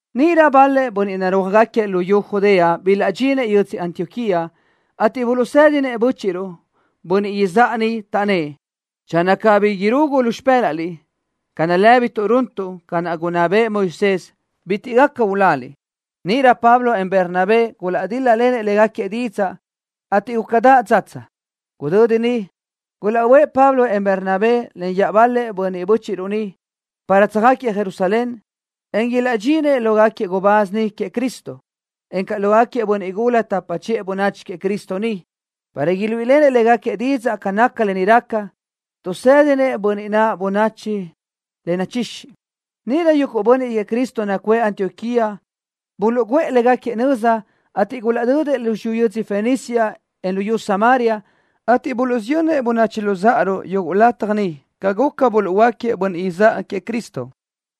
Níʼirö bal-lëʼ bönniʼ narúajgaquiëʼ luyú Judea bilaʼdxinëʼ yödzö Antioquía, ateʼ buluʼsë́dinëʼ bö́chiʼruʼ, bönniʼ izáʼa niʼ, taʼnnë́ʼ: —Channö cabí irugu lu xipë́laʼliʼ ca nalë́bituʼ runtuʼ ca naʼ gunná bëʼë Moisés, bitiʼ gaca uláliʼ. Níʼirö Pablo, en Bernabé gulaʼdíl-lalenëʼ légaquiëʼ didzaʼ, ateʼ gúcadaʼ dzatsa. Gudödi niʼ, gulaʼbö́ëʼ Pablo, en Bernabé len iaʼbal-lëʼ bönniʼ bö́chiʼruʼ niʼ, para tsöjáquiëʼ Jerusalén, en ilaʼdxinëʼ lógaquiëʼ gubáz niʼ queëʼ Cristo, encaʼ lógaquiëʼ bönniʼ gula tapa chiʼë bönachi queëʼ Cristo niʼ, para iluíʼilenëʼ légaquiëʼ didzaʼ ca naca lë ni raca, tuʼsédinëʼ bönniʼ naʼ bönachi le nachixi. Níʼirö yuguʼ bönniʼ queëʼ Cristo nacuʼë Antioquía buluʼguʼë légaquiëʼ nöza, ateʼ gulaʼdödëʼ lu xiyú yödzö Fenicia, en luyú Samaria, ateʼ buluʼsiyönnëʼ böchiʼ luzáʼaruʼ yuguʼ lataj niʼ ca guca, buluʼhuöáquiëʼ bönniʼ izáʼa queëʼ Cristo.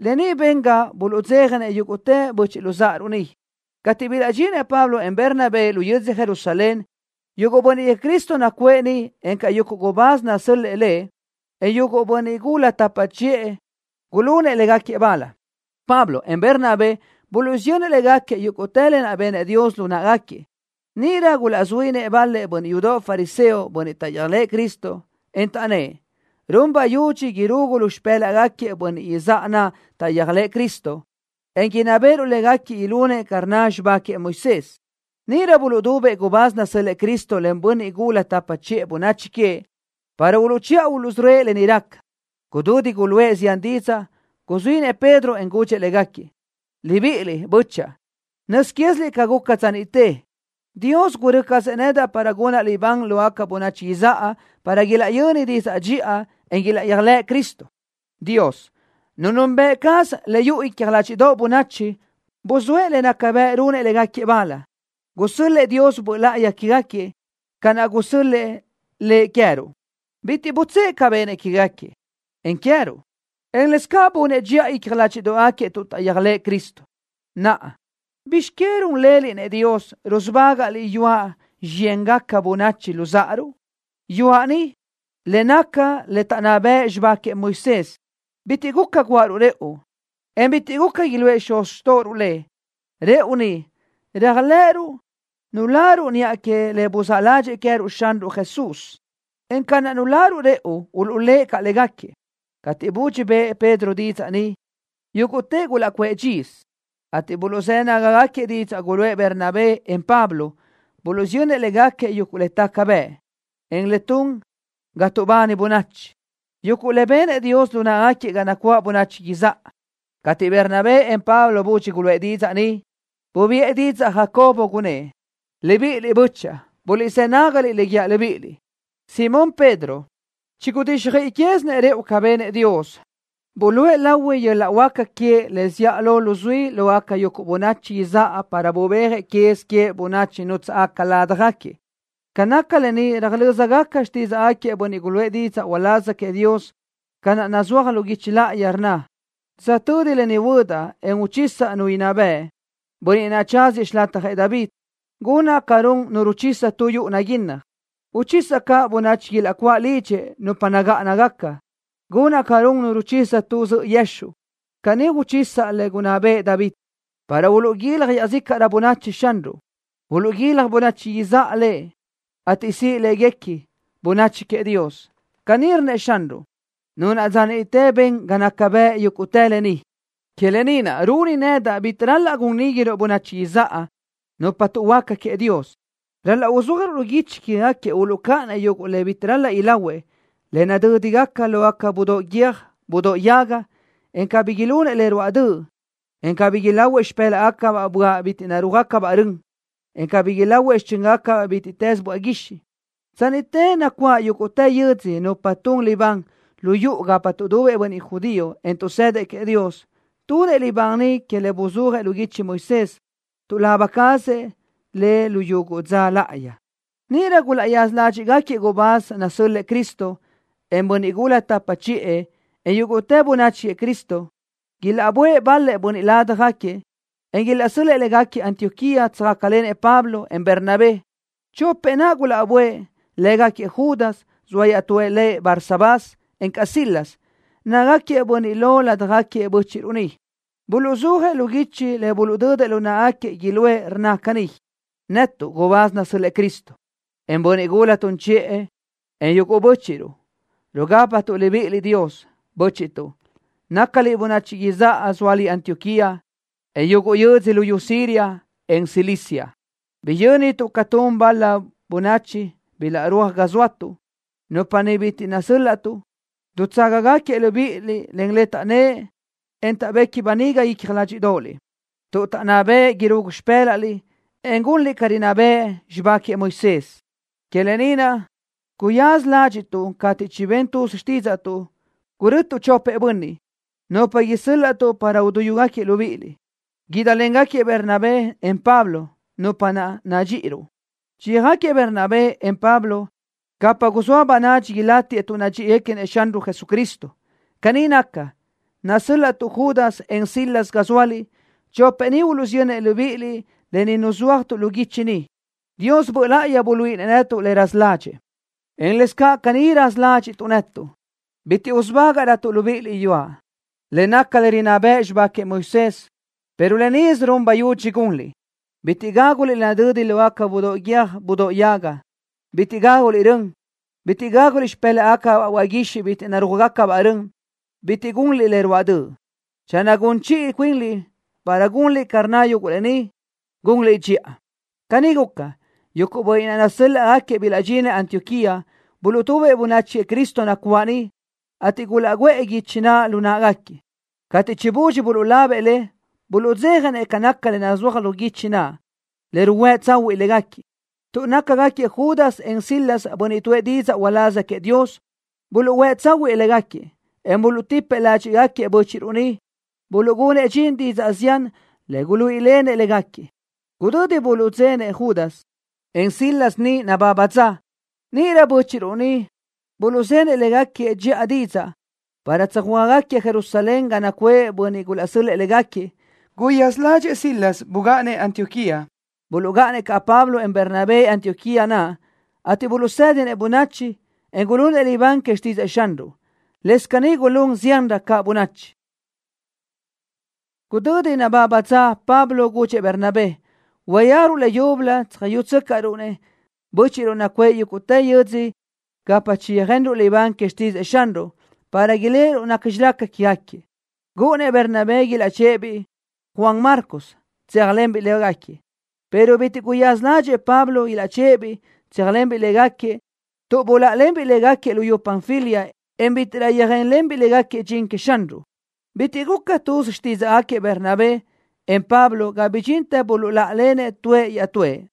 Lë ni ben ga buluʼdzéjanëʼ yúguʼtë böchiʼ luzáʼaruʼ niʼ. Cateʼ bilaʼdxinëʼ Pablo, en Bernabé lu yödzö Jerusalén, yuguʼ bönniʼ queëʼ Cristo nacuʼë niʼ, encaʼ yuguʼ gubáz nasö́l-lëʼë Lëʼ, en yuguʼ bönniʼ gula tapa chiʼë gulunëʼ légaquiëʼ bal. Pablo, en Bernabé buluʼsiyönnëʼ légaquiëʼ yúguʼtë le benëʼ Dios lu náʼagaquiëʼ. Níʼirö gulaʼzuínëʼ bal-lëʼ bönniʼ yudoʼ fariseo, bönniʼ taʼyéajlëʼë Cristo, en taʼnnë́ʼ: —Run bayudxi irugu lu xipë́laʼgaquiëʼ bönniʼ izáʼa naʼ taʼyéajlëʼë Cristo, en inná béʼeruʼ légaquiëʼ ilunëʼ ca rnna bëʼ xibá queëʼ Moisés. Níʼirö buluʼdubëʼ gubáz nasö́l-lëʼë Cristo len bönniʼ gula tapa chiʼë bönachi queëʼ, para uluʼchiʼa uluʼsörö́ëʼ lë ni raca. Gudödi guluʼë zián didzaʼ, guzuínëʼ Pedro, en gudxëʼ légaquiëʼ: —Libiʼiliʼ, bö́chaʼa. Nöz quéziliʼ ca guca dza niʼte, Dios gurö́ cazëʼ nedaʼ para gunaʼ libán lógaca bönachi izáʼa para ilaʼyöni didzaʼ dxiʼa, en ilaʼyéajlëʼ Cristo. Dios, Nu nunbëʼ caz le yuʼu icja ládxiʼdoʼgaca bönachi, buzóëʼ le naca bëʼ runëʼ légaquiëʼ bal, gusö́l-lëʼë Dios Böʼ Láʼayi quégaquiëʼ, ca naʼ gusö́l-lëʼë Lëʼ queë́ruʼ. Bitiʼ butsë́ʼë ca benëʼ quégaquiëʼ, en queë́ruʼ, en lëscaʼ bunëʼ dxiʼa icja ládxiʼdoʼgaquiëʼ tuʼ taʼyéajlëʼë Cristo. Naʼa, ¿bizx que run leliʼ-nëʼ Dios, rusubágaʼliʼ yuaʼ xiyéngaca böchiʼ luzáʼaruʼ? Yuaʼ ni, le naca le taʼnná bëʼ xibá queëʼ Moisés, bitiʼ guca guáʼaruʼ rëʼu, en bitiʼ guca iluʼë xuz xtóʼoruʼ le. Rëʼu ni, réajlëʼëruʼ nuláruʼ niʼa que le buzáʼ ládxëʼë Xanruʼ Jesús queë́ruʼ, en ca naʼ nuláruʼ rëʼu, uluʼlë́ʼ caʼ légaquiëʼ. Cateʼ budxi bëʼë Pedro didzaʼ ni, yúguʼtëʼ gulaʼcuʼë dxisö, ateʼ buluʼzë́ nágagaquiëʼ didzaʼ guluʼë Bernabé, en Pablo. Buluʼsiyönnëʼ légaquiëʼ yuguʼ le taca bëʼ, en le tun ga tuʼbani bönachi, yuguʼ le benëʼ Dios lu náʼagaquiëʼ ga nacuáʼ bönachi izáʼa. Cateʼ Bernabé, en Pablo budxi guluʼë didzaʼ ni, bubiʼë didzaʼ Jacobo, gunnë́ʼ: —Libiʼiliʼ, bö́chaʼa. Buliʼzë́ nágaliʼ le guíaʼ libíʼiliʼ. Simón Pedro chigudíxjöiʼi quézinëʼ rëʼu ca benëʼ Dios, buluʼe lahui yöl-laʼ huáca queëʼ le zíʼalö luzuí lógaca yuguʼ bönachi izáʼa para bubéajëʼ quez queëʼ bönachi nútsaʼgaca ládjagaquiëʼ. Ca naca lë ni röjlö́zgaca xtídzaʼgaquiëʼ bönniʼ guluʼë didzaʼ uláz queëʼ Dios, ca naʼ nazúaj lu guichi láʼayi, rnna: Dza tödi lë ni huödaʼ, en uchisaʼ Nu inná bëʼ, bönniʼ naʼ tsáziëʼ xilatjëʼ David. Gunaʼ ca run nu ruchisa tu yuʼu naguinnaj. Uchisaʼ caʼ bönachi ilaʼcuáʼ lidxëʼ, nupa nagáʼanagaca. Gunaʼ ca run nu ruchisa tu zöʼö yexuʼ. Caní uchisaʼ le gunná bëʼë David para uluʼguilaj iaʼzícaʼrö bönachi Xanruʼ. Uluʼguilaj bönachi izáʼa Lëʼ, ateʼ siʼ láguequi: Bönachi Queëʼ Dios. Caní rnnëʼ Xanruʼ, Nu naʼ dza niʼte ben ga naca bëʼ yúguʼtë lë ni. ’Que lë ni naʼ runi nedaʼ bitiʼ ral-laʼ gun níguiruʼ bönachi izáʼa, nupa tuʼhuöáca queëʼ Dios. Ral-laʼ uzúajruʼ lu guichi quégaquiëʼ uluʼcáʼanëʼ yuguʼ le bitiʼ ral-laʼ ilahuëʼ, le nadödi lógaca budóʼ guiö́j budóʼ yaga, en cabí ilunëʼ le ruáʼ döʼ, en cabí ilahuëʼ xipë́laʼgacabaʼ böaʼ guixiʼ bitiʼ narúaj-gácabaʼ rön, en cabí ilahuëʼ xichönbaʼ bítiʼtës böaʼ guixiʼ. Dza niʼte nacuáʼ yúguʼtë yödzö nupa tun libán lu yuʼu gapa tuʼdubëʼ bönniʼ judío, en tuʼsëdëʼ queëʼ Dios. Tunëʼ libán niʼ que le buzúajëʼ lu guichi Moisés. Tuʼlaba cazëʼ le yuguʼ dza láʼayi. Níʼirö gulaʼyaza ládxiʼgaquiëʼ gubáz nasö́l-lëʼë Cristo, en bönniʼ gula tapa chiʼë, en yúguʼtë bönachi queëʼ Cristo, ilaʼbö́ëʼ bal-lëʼ bönniʼ ládjagaquiëʼ, en ilaʼsö́l-lëʼë légaquiëʼ Antioquía. Tsöjácalenëʼ Pablo, en Bernabé. Chopëʼ naʼ gulaʼbö́ëʼ, lë́gaquiëʼ Judas, zoa iaʼtú lëʼ Barsabás, encaʼ Silas. Nácagaquiëʼ bönniʼ lo ládjagaquiëʼ bö́chiʼruʼ niʼ. Buluʼzúajëʼ lu guichi le buluʼdödëʼ lu náʼagaquiëʼ iluʼë, le rnna caní: “Netuʼ, gubáz nasö́l-lëʼë Cristo, en bönniʼ gula tun chiʼë, en yuguʼ bö́chiʼruʼ, rugápatuʼ libíʼiliʼ Dios, bö́chiʼtuʼ, nácaliʼ bönachi izáʼa zóaliʼ Antioquía, en yuguʼ yödzö luyú Siria, en Cilicia. Biyö́nituʼ ca tun bal-la bönachi bilaʼrúaj ga zóatuʼ, nupa naʼ bitiʼ nasö́l-laʼtuʼ. Dutsáʼagaquiëʼ libíʼiliʼ len le taʼnnë́ʼ, en tuʼbequi böniga icja ládxiʼdoʼoliʼ, tuʼ taʼnná bëʼë irugu lu xipë́laʼliʼ, en gunliʼ ca rinná bëʼ xibá queëʼ Moisés. Que lë ni naʼ guyaza ládxiʼtuʼ cateʼ chibén tuz xtídzaʼtuʼ, gurötuʼ chopëʼ bönniʼ, nupa isö́l-laʼtuʼ para uduyúgaquiëʼ libíʼiliʼ. Guídlengaquiëʼ Bernabé, en Pablo, nupa naʼ nadxíʼiruʼ. Chiyöjáquiëʼ Bernabé, en Pablo gapa guzóa bönadxi ilátiëʼ tuʼ nadxíʼiguequinëʼ Xanruʼ Jesucristo. Caní naca, risö́l-laʼtuʼ Judas, en Silas ga zóaliʼ. Chopëʼ ni uluʼsiyönnëʼ libíʼiliʼ lë ni ruzúajtuʼ lu guichi ni. Dios Böʼ Láʼayi buluíʼinëʼ netuʼ le raza ládxëʼë, en lëscaʼ caní raza ládxiʼtuʼ netuʼ, bitiʼ usubágaʼrötuʼ libíʼiliʼ yuaʼ, le naca le rinná bëʼ xibá queëʼ Moisés, pero yuguʼ lë nisö run bayudxi gunliʼ: Bitiʼ gáguliʼ le nadödi lógaca budóʼ guiö́j budóʼ yaga. Bitiʼ gáguliʼ rön. Bitiʼ gáguliʼ xipë́laʼgacabaʼ böaʼ guixiʼ bitiʼ narúaj-gácabaʼ rön. Bitiʼ gunliʼ le ruáʼ döʼ. Channö gun chiʼi cuinliʼ para gunliʼ ca rnna yuguʼ lë ni, gunliʼ dxiʼa.” Caní guca, yuguʼ bönniʼ naʼ nasö́l-laʼgaquiëʼ bilaʼdxinëʼ Antioquía. Buluʼtubëʼ bönachi queëʼ Cristo nacuáʼ niʼ, ateʼ gulaʼguʼë guichi naʼ lu náʼagaquiëʼ. Cateʼ chibudxi buluʼlabëʼ le, buluʼdzéjanëʼ ca naca le nazúaj lu guichi naʼ, le ruhuë́ tsahuiʼ légaquiëʼ. Tuʼ nácagaquiëʼ Judas, en Silas bönniʼ tuʼë didzaʼ uláz queëʼ Dios buluʼhuë́ tsáhuëʼë légaquiëʼ, en buluʼtipëʼ ládxiʼgaquiëʼ bö́chiʼruʼ niʼ, buluʼgunëʼ dxin didzaʼ zián le guluíʼilenëʼ légaquiëʼ. Gudödi buluʼdzénëʼ Judas, en Silas niʼ nababa dza, níʼirö bö́chiʼruʼ niʼ buluʼzenëʼ légaquiëʼ dxiʼa didzaʼ para tsöjhuö́ajgaquiëʼ Jerusalén ga nacuʼë bönniʼ gulaʼsö́l-lëʼë légaquiëʼ. Guyaza ládxëʼë Silas bugáʼanëʼ Antioquía. Buluʼgáʼanëʼ caʼ Pablo, en Bernabé Antioquía naʼ, ateʼ buluʼsédinëʼ bönachi, en gulunëʼ libán que xtídzëʼë Xanruʼ. Lëscaʼ caní gulún ziánrö caʼ bönachi. Gudödi nababa dza Pablo gudxëʼ Bernabé: —Uyéajruʼ leyúbölö tsöjyúgacaruʼ-nëʼ bö́chiʼruʼ nacuʼë yúguʼtë yödzö gapa chiyöjenruʼ libán que xtídzëʼë Xanruʼ, para iléʼeruʼ nacxi raca quégaquiëʼ. Gúʼunnëʼ Bernabé ilaʼchë́ʼë-biʼ biʼi Juan Marcos, tséajlenbiʼ légaquiëʼ, pero bitiʼ guyaza ládxëʼë Pablo ilaʼchë́ʼë-biʼ tséajlenbiʼ légaquiëʼ tuʼ buláʼalenbiʼ légaquiëʼ luyú Panfilia, en bítiʼrö yöjénlenbiʼ légaquiëʼ dxin queëʼ Xanruʼ. Bitiʼ guca tuz xtídzaʼgaquiëʼ Bernabé, en Pablo ga bidxintë buluʼláʼalenëʼ tuëʼ iaʼtúëʼ.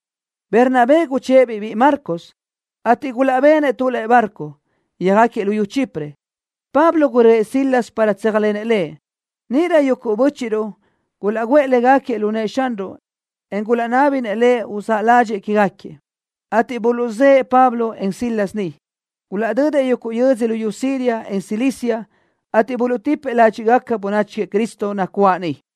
Bernabé guchë́ʼë-biʼ biʼi Marcos, ateʼ gulaʼbenëʼ tu lëʼe barco, yöjáquiëʼ luyú Chipre. Pablo gurö́ëʼ Silas para tséajlenëʼ lëʼ. Níʼirö yuguʼ bö́chiʼruʼ gulaʼguʼë légaquiëʼ lu nëʼë Xanruʼ, en gulaʼnábinëʼ Lëʼ uzáʼ ládxëʼë quégaquiëʼ, ateʼ buluʼzë́ʼë Pablo, en Silas niʼ. Gulaʼdödëʼ yuguʼ yödzö luyú Siria, en Cilicia, ateʼ buluʼtipëʼ ládxiʼgaca bönachi queëʼ Cristo nacuáʼ niʼ.